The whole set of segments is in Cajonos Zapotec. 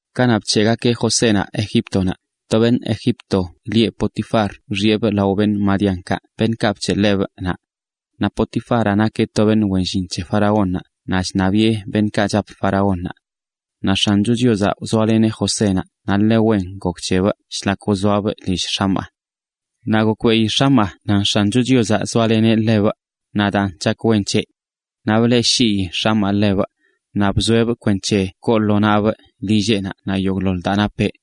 Kanaꞌ bc̱heꞌgakeꞌ Josénaꞌ Egíptonaꞌ, to beṉꞌ Egipto lieꞌ Potifar wxiꞌebꞌ lao madianitakaꞌ, beṉꞌkaꞌ bc̱heꞌ ḻebꞌ naꞌ. Naꞌ Potifaraꞌ nakeꞌ to beṉꞌ wen llin c̱he faraónnaꞌ naꞌ chṉabiꞌe beṉꞌkaꞌ chap faraónnaꞌ. Naꞌ X̱ancho Chiozaꞌ zoaleneꞌ Josénaꞌ naꞌ ḻe wen gok c̱hebꞌ shlak wzoabꞌ lill x̱amaa. Naꞌ gokbeꞌi x̱amaa nan X̱ancho Chiozaꞌ zoaleneꞌ ḻebꞌ, naꞌ daan chak wen c̱heꞌ. Naꞌ bleꞌshii x̱amaa ḻebꞌ, naꞌ bzoeꞌbꞌ kwenc̱he koo lo nabꞌ lilleꞌnaꞌ naꞌ yogꞌḻoḻ daa napeꞌ.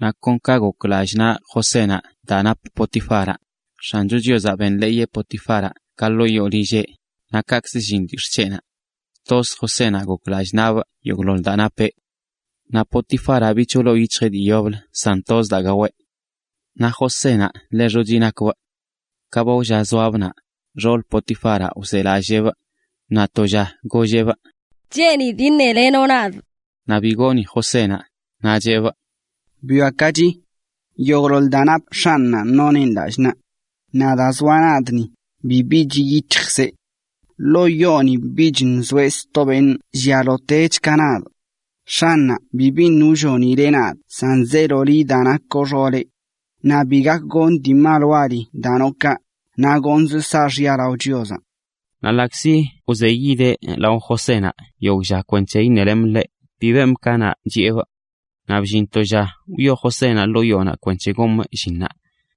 Naꞌ kon ka gok lallꞌ naꞌ Josénaꞌ daa nap Potifaraꞌ, X̱ancho Chiozaꞌ benḻeeyeꞌ Potifaraꞌ ka ḻoo yoo lilleꞌnaꞌ, naꞌ kaꞌkzə llin lyix̱ꞌ c̱heꞌnaꞌ. Toz Josénaꞌ gok lallꞌ nabꞌ yogꞌḻoḻ daa napeꞌ. Naꞌ Potifaraꞌ bich bi wloo yic̱hjeꞌ dii yoblə san toz daa gaweꞌ. Naꞌ Josénaꞌ ḻe xochi nakbꞌ. Ka ba wlla zoabꞌ naꞌ, xoolə Potifaraꞌ wzelalleebꞌ, naꞌ to lla golleꞌbꞌ: ―Cheenidꞌ iṉelenoꞌ nadꞌ. Naꞌ bi gooni Josénaꞌ, naꞌ cheꞌbꞌ: ―Bwiakachi. Yogꞌḻoḻ daa nap x̱anꞌnaꞌ noneꞌn lallꞌ naꞌ. Naꞌ daa zoaꞌ ni, bibi chiꞌ yic̱hjkzeꞌ. Ḻoo yoo ni bich nzoeꞌ sto beṉꞌ llialotech ka nadꞌ. X̱anꞌnaꞌ bi biṉꞌ wllonileꞌ nadꞌ san zeelo liꞌ daa nakoꞌ xooleꞌ. Naꞌ bi gak gonꞌ dii mal wali daa noꞌ kaꞌ, naꞌ gonzꞌ saaxya lao Chiozaꞌ. Naꞌ ḻaꞌkzi wzeyideꞌ lao Josénaꞌ yogꞌ lla kwenc̱he iṉelemꞌ ḻe, bi bemꞌ ka chiꞌebꞌ. Naꞌ bllin to lla wyoo Josénaꞌ ḻoo yoonaꞌ kwenc̱he gomꞌ llinnaꞌ.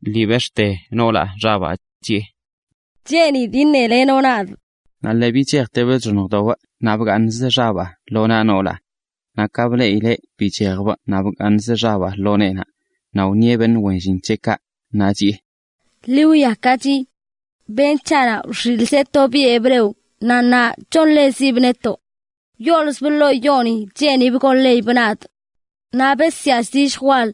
lii bex̱ꞌte noolaꞌ xabaa, chiꞌe: ―Cheenidꞌ iṉelenoꞌ nadꞌ. Naꞌ lii bichejtebꞌ chxoṉjdobꞌ naꞌ bgaaṉzə xabaa lo naꞌ noolaꞌ. Naꞌ ka bleꞌileꞌ bichejbꞌ naꞌ bgaaṉzə xabaa lo neenaꞌ, naꞌ wṉieꞌ beṉꞌ wen llinkaꞌ, naꞌ chiꞌe: ―Ḻi wwiakachi. Beṉꞌ c̱haꞌnaꞌ wxiꞌlzeꞌ to biꞌ hebreo, naꞌ ṉaa chonḻezibꞌ netoꞌ. Wyoolzbꞌ ḻoo yooni cheenibꞌ gonḻeyibꞌ nadꞌ. Naꞌ besyaa zilljə wal.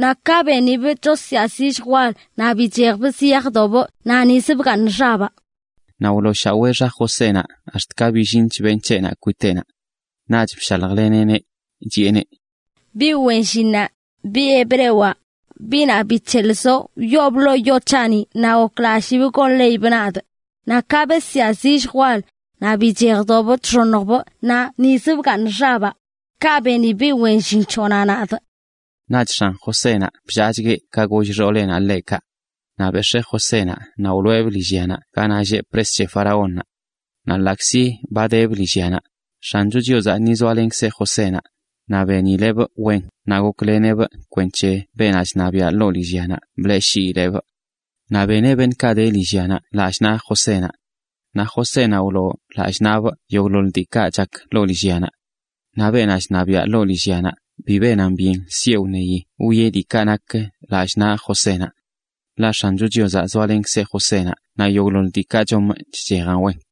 Naꞌ ka benibꞌ chosyaa zilljə wal, naꞌ bichejbꞌ ziyajdobꞌ naꞌ nizə bgaaṉ xabaa. Naꞌ wlooshawee xa Josénaꞌ ax̱t ka billinch beṉꞌ c̱heꞌnaꞌ kwiteꞌnaꞌ. Naꞌch bshaljleneꞌneꞌ, chiꞌeneꞌ: ―Biꞌ wen llinnaꞌ, biꞌ hebrewaꞌ, biꞌnaꞌ bic̱heꞌlzoꞌ, wyoobꞌ ḻoo yoo c̱haꞌni naꞌ goklallibꞌ gonḻeyibꞌ nadꞌ. Naꞌ ka besyaa zilljə wal, naꞌ bichejdobꞌ chxoṉjbꞌ naꞌ nizə bgaaṉ xabaa. Kaꞌ beni biꞌ wen llin c̱hoꞌnaꞌ nadꞌ. Naꞌch x̱an Josénaꞌ bllaachgueꞌ ka goll xooleꞌnaꞌ ḻeꞌ kaꞌ. Naꞌ bex̱ee Josénaꞌ naꞌ wloꞌebꞌ lillya ganaꞌ lleꞌ pres c̱he faraónnaꞌ. Naꞌ ḻaꞌkzi ba debꞌ lillyanaꞌ, X̱ancho Chiozaꞌ ni zoalenkzeꞌ Josénaꞌ, naꞌ benileꞌbꞌ wen naꞌ gokleneꞌbꞌ kwenc̱he beenaꞌ chṉabiaꞌ ḻoo lillyanaꞌ bleꞌshiileꞌbꞌ. Naꞌ beneꞌ beṉꞌkaꞌ de lillyanaꞌ lallꞌ naꞌ Josénaꞌ. Naꞌ Josénaꞌ wloo lallꞌ nabꞌ yogꞌḻoḻ diikaꞌ chak ḻoo lillyanaꞌ. Naꞌ beenaꞌ chṉabiaꞌ ḻoo lillyanaꞌ bi benan byen sieꞌ wṉeyi wwieꞌ diikaꞌ nak lallꞌ naꞌ Josénaꞌ. Ḻaꞌ X̱ancho Chiozaꞌ zoalenkzeꞌ Josénaꞌ naꞌ yogꞌḻoḻ diikaꞌ chomꞌ chchejan wen.